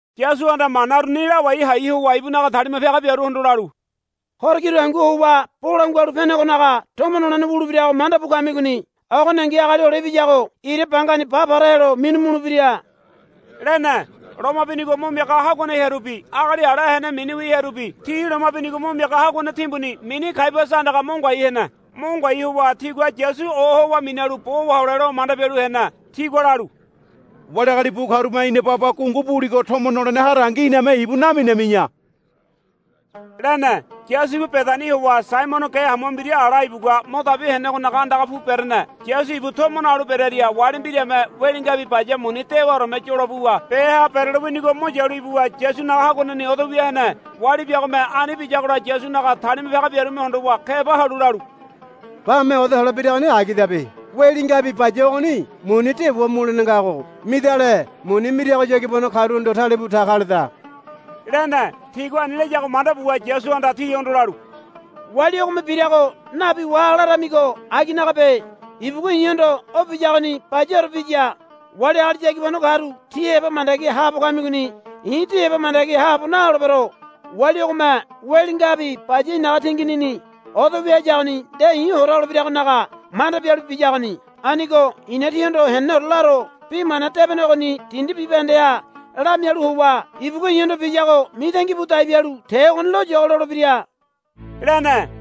Yasuhanda mana uruni lawai hai howa ibunaga talima piaga biaruhondo lalu, Horo kiru hangu howa Bolangua Halu Penegonaga tomo nolene wulebirago manda bu kamigoni. Ogoningi Agali Hole Ibiyago ira bangani ba para helo minu mulebira, lene. Loma binigo mo miaga haguane hearubi agali ala hene miniwi hearubi ti loma binigo mo miaga haguane timbuni mini Kaiabasa andaga mo ngoai hene. Mo ngoai howa tigua Yasu ohowa minalu bo wahole lo manda bialu hene. Tigua lalu, Wali agali bu karume ina baba gungu buligo tomo nolene harangi iname ibu naminami̱ya, lene. Yasu ibu Bedani howa Saimono ge hamua mbira ala ibugua mo dabi henegonaga andaga pu berene. Yasu ibu tomo nalu berearia wali mbirame weli ngabi baya muni dewaoreme yolo buwa beha berelo winigo mo yalu ibuwa Yasunaga haguaneni odo wia hene. Wali biagome ani biyagola Yasunaga talima piaga biarume hondowa keba halu lalu, Bame oda hole biragoni agidabe. Weli ngabi baya ogoni muni dewa mulene ngago midale muni mirago yagibano karuhondo talebu ta kaleda, lene. Tigua ani layago manda buwa Yasuhanda tihondo lalu, Wali ogome birago nabi waha laramigo aginagabe. Ibugua i̱hondo o biyagoni bayaore biya. Wali agali yagibano karu tí heba mandagi haabo kamigoni. I̱ tí heba mandagi haabo naholebero. Wali ogome weli ngabi baya i̱naga tinginini odo wia hayagoni nde i̱ hora holebiragonaga manda bialu biyagoni. Anigo i̱na tíhondo heneneore laro. Bi Mana Debene ogoni dindi bibahendeha lamialu howa ibugua i̱hondo biyago mitangi bu dai bialu te ogoni loyogo lolebira, lene.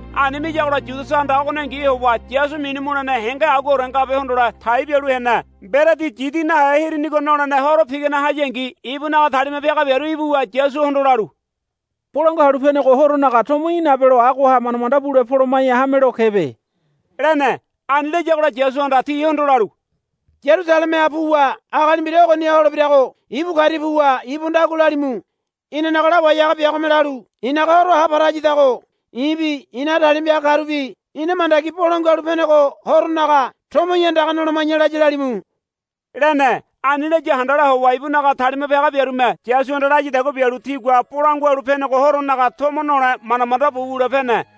Ani miyagola Yudasahanda ogoningi howa Yasu minu mulene henge aguaore ngabe hondole tai bialu hene. Mberedi Yidi Nahe Hirinigo nolene horo pigane hayangi ibunaga talima piaga biaru ibuwa Yasuhondo lalu, Bolangua Halu Penego Horonaga tomo í̠ nabelo agoha manda manda bule poloma̱ya hamelo kebe, lene. Ani layagola Yasuhanda tihondo lalu, Yarusalemeha puwa agali mbira ogoniha holebirago ibu karia puwa ibuhondo agua lalimu. Inanaga Lawai Haga biagome lalu, I̱naga horo ha para hayadago i̱bi i̱naga talima piaga karubi ina mandagi Bolangua Halu Penego Horonaga tomo í̠ andaga noloma̱ya, laya lalimu, lene. Ani laya handala howa ibunaga talima piaga biarume Yasuhanda layadagua bialu tigua Bolangua Halu Penego Horonaga tomo nole manda manda bu wule pene.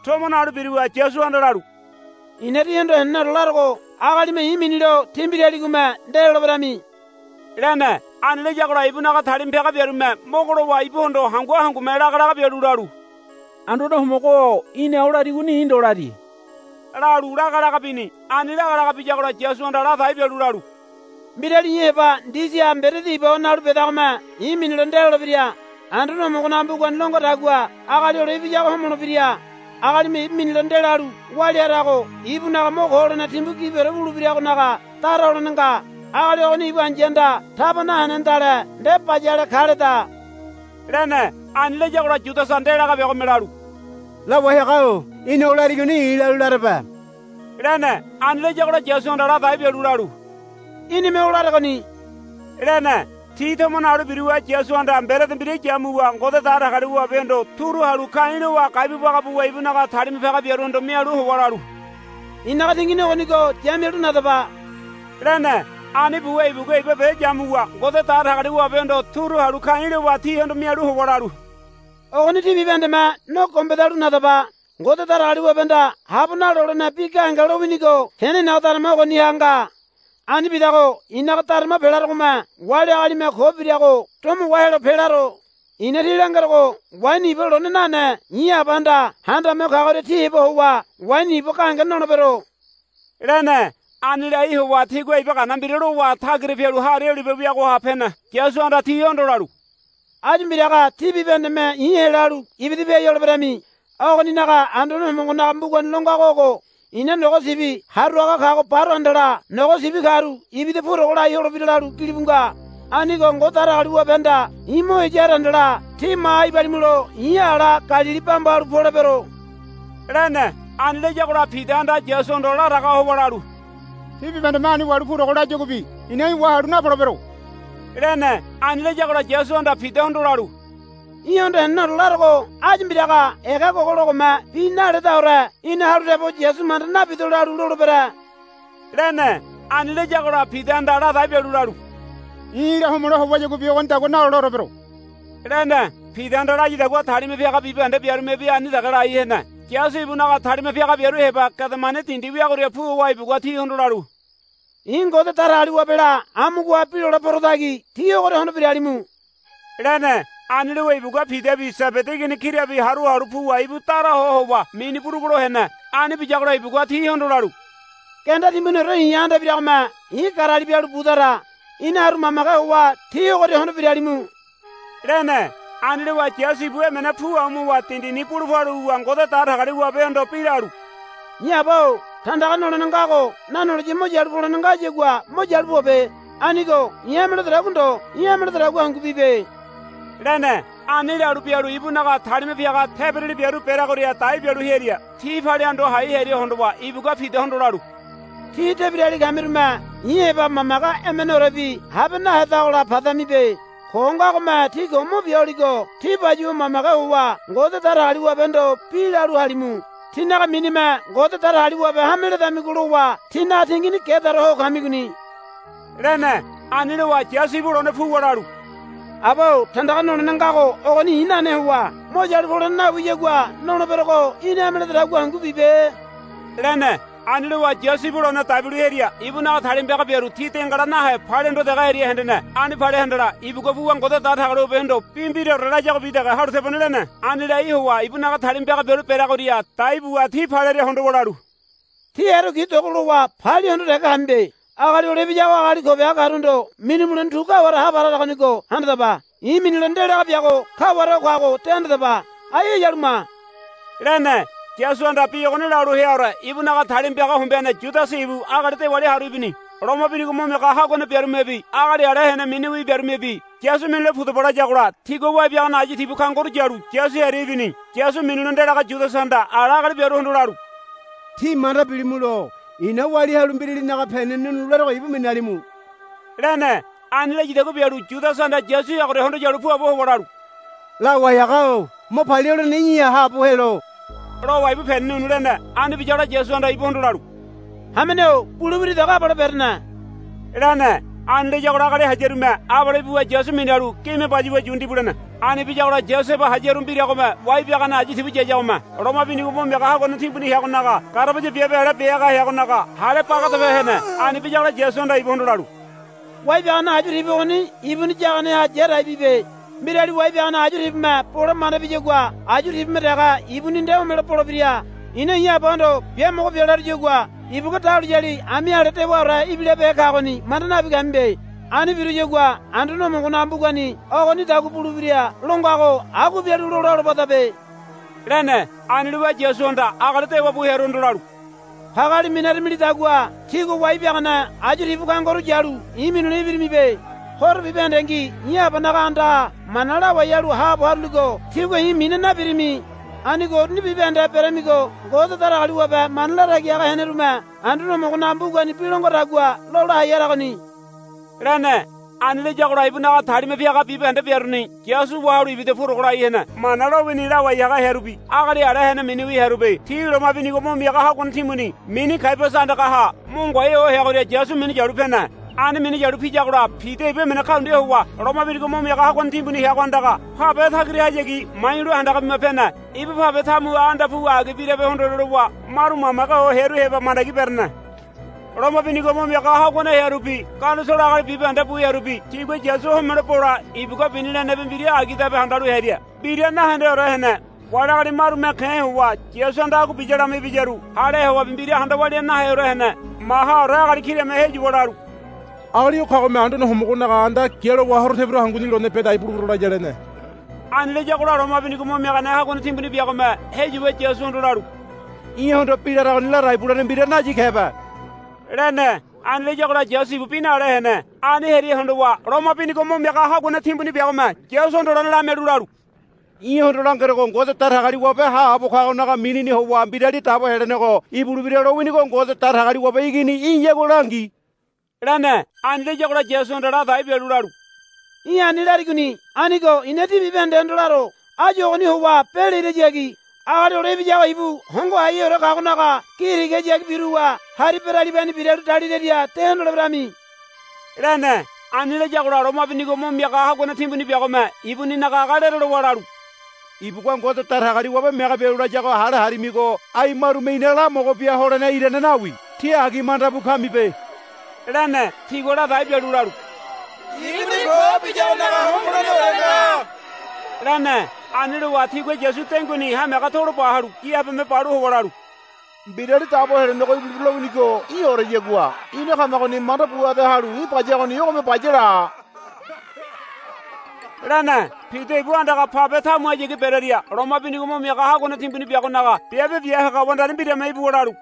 Tomo nalu biruwa Yasuhanda lalu, I̱na tíhondo heneneore larogo. Agalime i̱ minilo tí mbiraligome nde loleberami, lene. Ani layagola ibunaga talima piaga biarume mogo lowa ibuhondo hangu hangume lagalaga bialu lalu, Anduane Homogo-o í̠na o larigoni i̱ ndo lari, lalu laga laga bini. Ani lagalaga biyagola Yasuhanda ladai bialu lalu, Mbirali i̱ heba ndisiha mberedi iba howa nalu bedagome i̱ minilo nde lolebira. Anduane Homogonaga mbugani lo ngadagua Agali Hole Ibiyago homolebira. Agalime ibu minilo ndelalu walia harago ibunaga mo ko holene timbu gibiore wulebiragonaga dara holene nga. Agali ogoni ibu ai̱yahanda taba nahenedale nde bayale kaleda, lene. Ani layagola Yudasa ndelaga biagome lalu, Lawai haga-o í̠na o larigoni i̱ lalu larebe, lene. Ani layagola Yasuhanda ladai bialu lalu, Í̠nime o laregoni, lene. Ti tomo nalu biruwa Yasuhanda mberedi mbira yamuwa Ngode Datagaliwabehondo turu halu ka̱i̱ lowa gai bu baga buwa ibunaga talima piaga biaruhondo mialu howa lalu, I̱naga tingini ogonigo ya mialu nadaba, lene. Ani buwa ibugua iba be yamuwa Ngode Datagaliwabehondo turu halu ka̱i̱ lowa tihondo mialu howa lalu, Ogoni tí bibahendeme no gombedalu nadaba. Ngode Datagaliwabehanda habo nalolene bi gahenge lowinigo tene i̱naga darama ogoniha nga. Ani bidago i̱naga darama pelarogome wali agalime ko birago domo wahelo pelaro. I̱na tí langerogo waini iba lone nane i̱ Abahanda Handame Ho Kagoria tí heba howa waini iba gahenge nolebero, lene. Ani lai howa tigua iba gana mbira lowa tagira pialu Hari Olibe weagoha pene. Yasuhanda tihondo lalu, Áyu mbiraga tí bibahendeme i̱ helalu ibida piai holeberami. Ogoninaga Anduane Homogonaga mbugani lo ngago ogo, I̱na nogo sibi haru haga kago baro handala nogo sibi karu ibida purogo lai holebira, lalu gilibu nga. Anigo Ngode Datagaliwabehanda i̱ mo heya hara handala tí maha ibalimulo i̱ ala Galili bamba halu polebero, lene. Ani layagola Pidahanda Yasuhondo laraga howa lalu, Ti bibahendeme ani wahalu purogo layaguabi i̱na í̠ wahalu napolebero, lene. Ani layagola Yasuhanda Pidahondo lalu, Í̠hondo heneneore larogo áyu mbiraga ega gogologome bi naledaore í̠na halu tebo, Yasu manda nabido, lalu lolebere, lene. Ani layagola Pidahanda ladai bialu lalu, I̱ í̠la homole howayaguabi ogonidagua naloleore bero, lene. Pidahanda layadagua talima piaga bibahende biarumebi ani dege lai hene. Yasu ibu ibunaga talima piaga biaru heba Gedemani dindi wiagoria pu howa ibugua tihondo lalu, I̱ Ngode Datagaliwabela amugoha bi lole porotagi tí ogoria hondo biralimu, lene. Ani lowa ibugua Pidabi Sebedi igini kirabi haru halu puwa ibu dara ho howa mini burugulo hene. Ani biyagola ibugua tihondo lalu, Genda timbuniore i̱ha anda ibiragome i̱ garali bialu budara. Ina haru mamage howa tí ogoria hondo biralimu, lene. Ani lowa Yasu ibu emene pu amu howa dindini bulu palu wuwa Ngode Datagaliwabehondo bi lalu, I̱ Aba-o tandaga nolene ngago nanoliya mo yalu polene ngayagua mo yalu pobe. Anigo i̱ hame ledodagua ndo í̠ hame lededagua hangu bibe, lene. Ani lalu bialu ibunaga talima piaga tebirali biaru bereagoria dai bialu hearia ti palia hondo hai hearia hondowa ibugua Pidahondo lalu, Tí tebirali kamirume i̱ heba mamage emeneorebi habe nahedagola padamibe. Ko ngagome tí ko mo bia holigo tí bayuwa mamage howa Ngode Datagaliwabehondo bi lalu halimu. Tínaga minime Ngode Datagaliwabe hame ledamigo lowa tínaga tingini gedaore ho kamigoni, lene. Ani lowa Yasu ibu lone puwa lalu, Aba-o tandaga nolene ngago ogoni i̱ nane howa mo yalu polene nawiyagua noleberogo í̠ni hame lededagua hangu bibe, lene. Ani lowa Yasu ibu lone dai bialu hearia ibunaga talima piaga biaru ti dengala nahe palia hondo dege hearia hendene. Ani palea handala ibugua puwa Ngode Datagaliwabehondo bi mbiraore layagobi dege halu tebone lene. Ani lai howa ibunaga talima piaga biaru bereagoria dai buwa ti palearia hondowa lalu, Tí erekui dogolowa palia hondo dege kamibe. Agali Hole Ibiyago agali ko biaga karuhondo minu mulene tu kaware ha para haragonigo handadaba. I̱ minilo ndelaga biago kaware o kago de handadaba. Ai heyalu ma, lene. Yasuhanda bi ogoni lalu heaore ibunaga talima piaga hombeane Yudasa ibu agali dewali haru ibini. Loma binigo mo miaga haguane biarumebi agali ala hene miniwi biarumebi, Yasu minule pudaba, layagola tigua wai biagane ayu tibu kangoru yalu Yasu hearia ibini. Yasu minilo ndelaga Yudasahanda ala agali biaruhondo lalu, Tí manda bilimulo i̱na walia halu mbiralinaga peni nu̱nu̱ larogo ibu minalimu, lene. Ani layadagua bialu Yudasahanda Yasu heagoria hondo yalu puabo howa lalu, Lawai haga-o mo palia holene í̠ha haabo helo, lowa ibu peni nu̱nu̱ lene. Ani biyagola Yasuhanda ibuhondo lalu, Hamene-o bule wiridago abale berene, lene. Ani layagola agali hayarume abale ibuwa Yasu minalu gime bayuwa yu ndibu lene. Ani biyagola Yasu heba hayaru mbiragome wai biagane ayu tibu yayagome loma binigo mo miaga haguane timbuni heagonaga garabaya biabe ale bia haga heagonaga hále bagadape hene. Ani biyagola Yasuhanda ibuhondo lalu, Wai biagane ayu tibu ogoni ibuni yaganeha ya dai bibe. Mbirali wai biagane ayu tibume bole manda biyagua ayu tibume dege ibuni nde homelo bolebira. I̱na i̱ Abahondo biamogo bia laruyagua ibugua dahuliyali ami ale dewaore ibilabehe kagoni manda nabi kamibe. Ani biruyagua Anduane Homogonaga mbugani ogonidagua bulebira lo ngago agua bialu lola holobadabe, lene. Ani lowa Yasuhanda agali dewa bu hearuhondo lalu, Pageali minaramilidagua tígua wai biagane ayu tibu kangoru yalu i̱ minule ibirimibe. Horo bibahendengi i̱ Abanaga andaha mana lawai halu haabo haruligo tígua i̱ mina nabirimi. Anigo uruni bibahende beramigo Ngode Datagaliwabe mana latagi haga henerume Anduane Homogonaga mbugani bi lo ngadagua lola hai haragoni, lene. Ani layagola ibunaga talima piaga bibahende biaruni Yasu wahalu ibida purogo lai hene. Mana lowini lawai haga hearubi agali ala hene miniwi hearubi ti loma binigo mo miaga haguane timbuni mini Kaiabasa andagaha mo ngoai ho heagoria Yasu minu yalu pene. Ani minu yalu piyagola Pida ibu emene kaundia howa loma binigo mo miaga haguane timbuni heago andaga pabe tagirahayagi mayu̱lo handaga bima pene. Ibu pabe tamuha anda puwa agi birabe hondole lowa maru mamage ho hearu heba mandagi berene. Loma binigo mo miaga haguane hearubi Ganisolo agali bibahende bu hearubi tigua Yasu homelo bole ibugua bini lenebi mbira agidabe handalu hearia mbira nahendeore hene. Wali agali marume ke̱ howa Yasuhanda agua biya lama ibiyaru hale howabi mbira handa walia naheore hene. Mahaore agali kirame heyuwa lalu, Agali o kagome Anduane Homogonaga anda gialowa horo tebiru hanguni lone bia dai bulebero laya, lene. Ani layagola loma binigo mo miaga haguane timbuni biagome heyuwa Yasuhondo lalu, Í̠hondo bi laragoni ladai bulene mbira nayi kebe, lene. Ani layagola Yasu ibu bi nale hene. Ani hearia hondowa loma binigo mo miaga haguane timbuni biagome Yasuhondo lone lamialu lalu, Í̠hondo langerogo Ngode Datagaliwabe haabo kagonaga minini howa Mbirali Dabo Helenego ibulebira lowinigo Ngode Datagaliwabe Igini í̠yagua langi, lene. Ani layagola Yasuhanda ladai bialu lalu, Í̠ ani larigoni. Anigo i̱na tí bibahendehondo laro. Áyu ogoni howa be lirahayagi Agali Hole Ibiyago ibu Hongo Haiheore Kagonaga gi tigahayagi biruwa hari beralibani biralu daliraria de hondoleberami, lene. Ani layagola loma binigo mo miaga haguane timbuni biagome ibuninaga aga lerelowa lalu, Ibugua Ngode Datagaliwabe mege bialu layago hale harimigo ai marume ina lamogo bia holene irane nawi. Tí agi manda bu kamibe, lene. Tigua ladai bialu lalu, Ibuni ko biyagonaga homoleneore nga, lene. Ani lowa tigua Yasu denguini hamiaga tolo ba halu gi habeme balu howa lalu, Mbirali Dabo Helenego ibulebira lowinigo í̠oreyagua ina kamagoni manda bu ade halu í̠ bayagoni ogome baya la, lene. Pida ibu andaga pabe tamuhayagi berearia loma binigo mo miaga haguane timbuni biagonaga biabe bia haga wandari mbirame ibuwa lalu,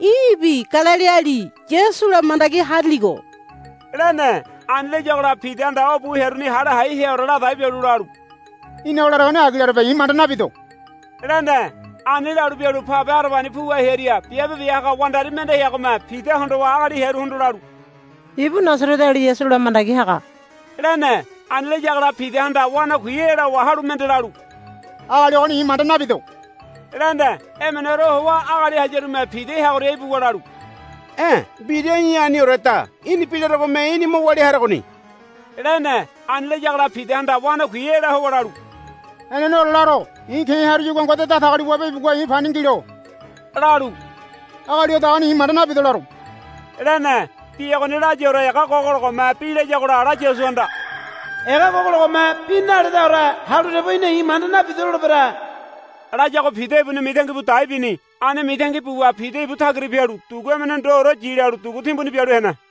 Í̠bi Galiliali Yasula mandagi hariligo, lene. Ani layagola Pidahanda o bu hearuni hale hai heaore ladai bialu lalu, Í̠na o laregoni agi larebe i̱ manda nabido, lene. Ani lalu bialu pabe harabani puwa hearia biabe bia haga wandari mende heagome Pida hondowa agali hearuhondo lalu, Ibu Nasareteali Yasula mandagi haga, lene. Ani layagola Pidahanda wanakui ela howa halu mende lalu, Agali ogoni i̱ manda nabido, lene. Emeneore howa agali hayarume Pida heagoria ibuwa lalu, E̱ mbira í̠ anioreda. Í̠ni bi laregome í̠ni mo walia haragoni, lene. Ani layagola Pidahanda wanakui ela howa lalu, Heneneore laro. I̱ ke̱ haruyagua Ngode Datagaliwabe ibugua i̱ pani ngilo, lalu, Agali odagoni i̱ manda nabido laro, lene. Bi ogoni layaore ega gogologome bi layagola ala Yasuhanda, Ega gogologome bi naledaore halu tebo í̠na i̱ manda nabido lolebere, layago Pida ibuni mitangi bu dai bini. Ani mitangi buwa Pida ibu tagira pialu dugu emene ndoore yi lalu dugu timbuni bialu hene.